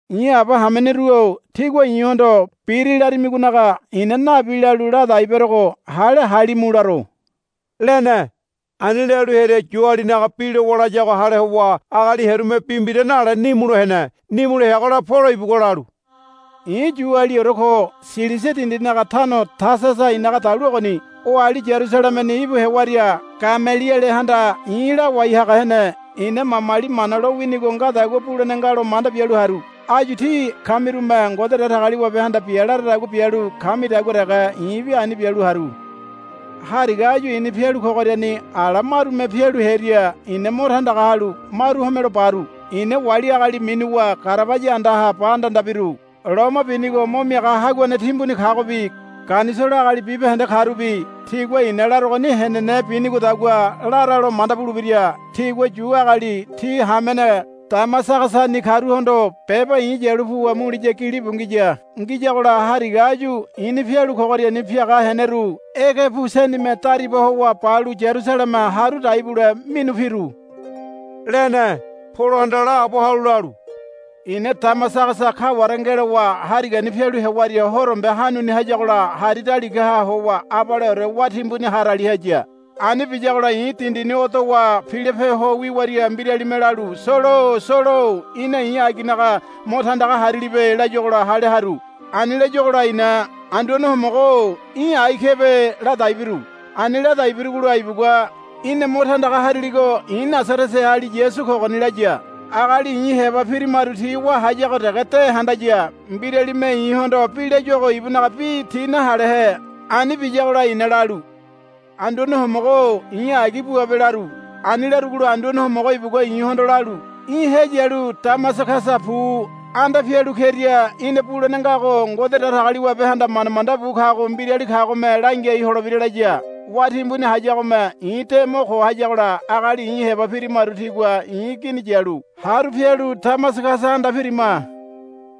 I̱ aba hameneru-o tígua i̱hondo, Biri, larimigonaga i̱na nabi lalu ladai berogo hale halimu laro, lene. Ani lalu hearia Yualinaga bi lowa layago hale howa agali hearume bi mbira nale nimulo hene. Nimulo heagola Polo ibugua lalu, I̱ Yualiore ko. Silisia dindinaga tano Tasasa i̱naga dalu ogoni. Oali Yarusalemeni íbu hewaria Gamelielehanda i̱ lawai haga hene. Ina mamali Mana lowinigo ngadagua bulene nga lo manda bialu haru. Áyu tí kamirume Ngode Datagaliwabehanda bia laradagua bialu kamidagua dege i̱bi ani bialu haru. Hariga áyu i̱ni pialu kogoriani ala marume pialu hearia i̱na mo tandaga halu maru homelo baru. I̱na wali agali minuwa garabaya andaha ba andanda biru. Loma binigo mo miaga haguane timbuni kagobi Ganisolo agali bibahende karubi tigua i̱na larogoni henene binigodagua laralo manda bulebira. Tigua Yu agali tí hamene Damasagasani karuhondo beba i̱ yalu puwa muliya gilibu ngiya. Ngiyagola Hariga áyu i̱ni pialu kogoriani piaga heneyaru ege pu senime dariba howa balu Yarusaleme haru dai bule minu piru, lene. Polohanda laabo halu lalu, I̱na Damasagasa kaware ngelowa harigani pialu hewaria horombe hanuni hayagola hari daligaha howa abaleore wá timbuni harali haya. Ani biyagola i̱ dindini odowa pilope ho wiwaria mbiralime lalu, Solo-o Solo-o í̠na i̱ aginaga mo tandaga harilibe, layuagola hale haru. Ani layuagola i̱na, Anduane Homogo-o í̠ ai kebe, ladai biru. Ani ladai birugola ibugua, Í̠na mo tandaga hariligo i̱ Nasareteali Yasu kogoni, laya. Agali i̱ heba pirimaru ti wá hayago dege de handaya. Mbiralime i̱hondo bi layuago ibunaga bi ti nahalehe. Ani biyagola i̱na lalu, Anduane Homogo-o i̱ agi buabe, laru. Ani larugola Anduane Homogo ibugua i̱hondo lalu, Í̠ heyalu Damasagasa pu. Anda pialu keria í̠na bulene ngago Ngode Datagaliwabehanda manda manda bu kago mbirali kagome langiai holebira, laya. Wá timbuni hayagome i̱ de mo ko hayagola agali i̱ heba pirimaru tigua i̱ gini yalu haru pialu Damasagasa anda pirima.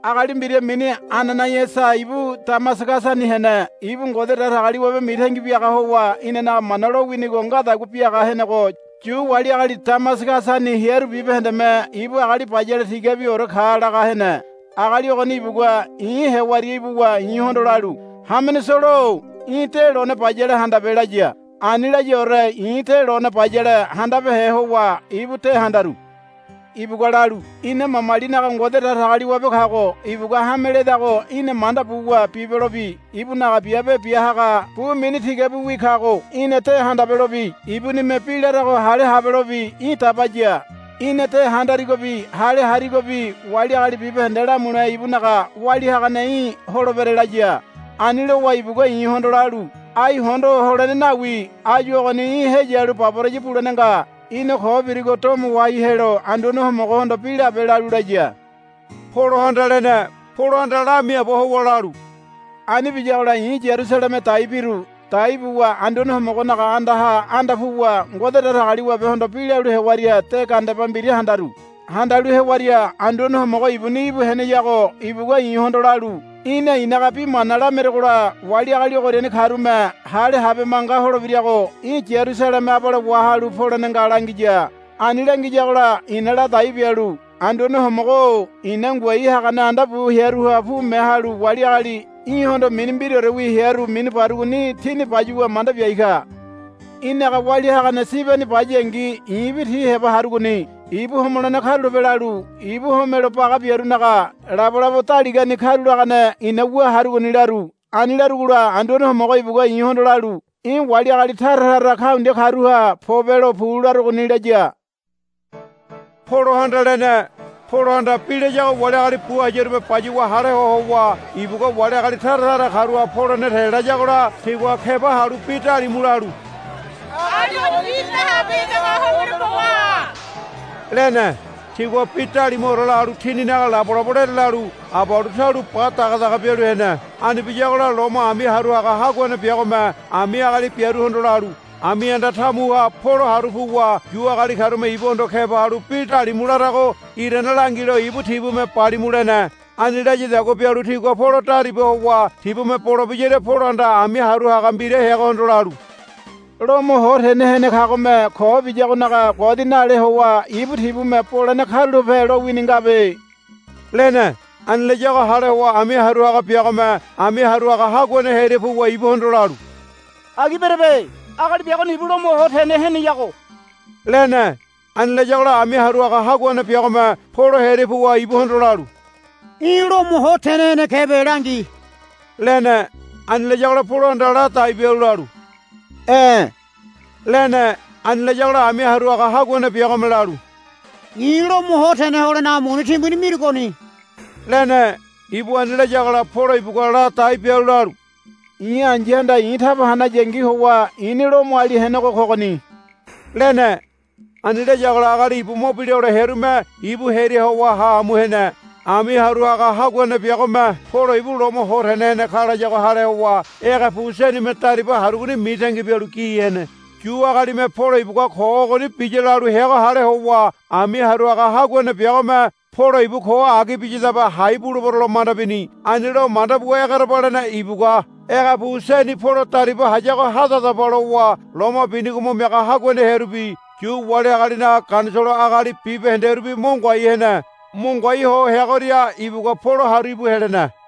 Agali mbira mini Ananaiasa ibu Damasagasani hene. Ibu Ngode Datagaliwabe mitangi biaga howa inanaga Mana lowinigo ngadagua biaga henego Yu wali agali Damasagasani hearu bibahendeme ibu agali bayale tigabiore ka laga hene. Agali ogoni ibugua i̱ hewaria ibuwa i̱hondo lalu, Hamene Solo-o í̠ de lone bayale handabe, laya. Ani layaore i̱ de lone bayale handabehe howa ibu de handaru. Ibugua lalu, Ina mamalinaga Ngode Datagaliwabe kago ibugua hame ledago í̠na manda buwa bibelobi ibunaga Biabe Bia haga bu mini tigabiwi kago í̠na de handabelobi ibunime bi larago hale habelobi í̠ dabaya. Í̠na de handarigobi hale harigobi wali agali bibahende lamule ibunaga walia hagane í̠ holebere, laya. Ani lowa ibugua i̱hondo lalu, Ai hondo holene nawi. Áyu ogoni í̠ heyalu baboraya bulene nga. Í̠na ko birigo domo wahai helo Anduane Homogohondo bi labe, lalu laya, Polohanda lene. Polohanda lamiaabo howa lalu, Ani biyagola i̱ Yarusaleme dai biru. Dai buwa Anduane Homogonaga andaha anda puwa Ngode Datagaliwabehondo bi lalu hewaria de gandeba mbira handaru. Handalu hewaria Anduane Homogo ibuni íbu heneyago ibugua i̱hondo lalu, Í̠na i̱naga bi mana lameregola wali agali ogoriani karume hale habe manga holebirago í̠ Yarusaleme abale wahalu polene nga, langiya. Ani langiyagola i̱na ladai bialu, Anduane Homogo-o i̱na ngoai hagane anda bu hearuha pume halu wali agali í̠hondo mini mbiraorewi hearu mini barugoni tini bayuwa manda biai ka. Í̠naga walia hagane Sibeni bayangi i̱bi ti heba harugoni. Ibu homolene karulape lalu ibu homelo baga biarunaga labolabo daligani karulagane i̱na wu harugoni, laru. Ani larugola Anduane Homogo ibugua i̱hondo lalu, Í̠ wali agali taratara kaundia karuha pobelo pu larogoni, laya, Polohanda lene. Polohanda bi layago wali agali bu hayarume bayuwa hale ho howa ibugua wali agali taratara karuha polene te layagola tigua keba halu bi dalimu lalu, Agali ogonibi nahabehedago homelo bo waha, lene. Tigua bi dalimuore lalu tininaga labolabo lerelalu abalu taulo ba dagadaga bialu hene. Ani biyagola Lomo ami haru haga haguane biagome ami agali biaruhondo lalu, Ami anda tamuha Polo haru puwa Yu agali karume ibuhondo keba halu bi dalimu larago irane langilo ibu tibume balimu, lene. Ani layadagua bialu tigua Polo dariba howa tibume bole biyaria Polohanda ami haru haga mbira heagohondo lalu, Lomo ho tene hene kagome ko biyagonaga godi nale howa ibu tibume bolene karulape lowini ngabe, lene. Ani layago hale howa ami haru haga biagome ami haru haga haguane hearia puwa ibuhondo lalu, Agi berebe. Agali biagoni ibu Lomo ho tene heneyago, lene. Ani layagola ami haru haga haguane biagome Polo hearia puwa ibuhondo lalu, Í̠ Lomo ho tene hene kebe langi, lene. Ani layagola Polohanda ladai bialu lalu, E̱, lene. Ani layagola ami haru haga haguane biagome lalu, I̱ Lomo ho tene holenaga muni timbuni mirugoni, lene. Ibu ani layagola Polo ibugua ladai bialu lalu, I̱ ai̱yahanda i̱ taba hanayangi howa i̱ni Lomoali henego kogoni, lene. Ani layagola agali ibu mo bila hole hearume ibu hearia howa ha amu hene. Ami haru haga haguane biagome Polo ibu Lomo ho tene hene ka layago hale howa ege pu senime dariba harugoni mitangi bialu gi hene. Yu agalime Polo ibugua ko ogoni biya lalu heago hale howa ami haru haga haguane biagome Polo ibu ko agi biyadabe hai bulebero lo manda bini. Ani lo manda buwa egerebalene ibugua, Ege pu seni Polo dariba hayago hadadaba, lowa loma binigo mo miaga haguane hearubi Yu wali agalinaga Ganisolo agali bibahenderubi mo ngoai hene. Mo ngoai ho heagoria ibugua Polo haru íbu helene.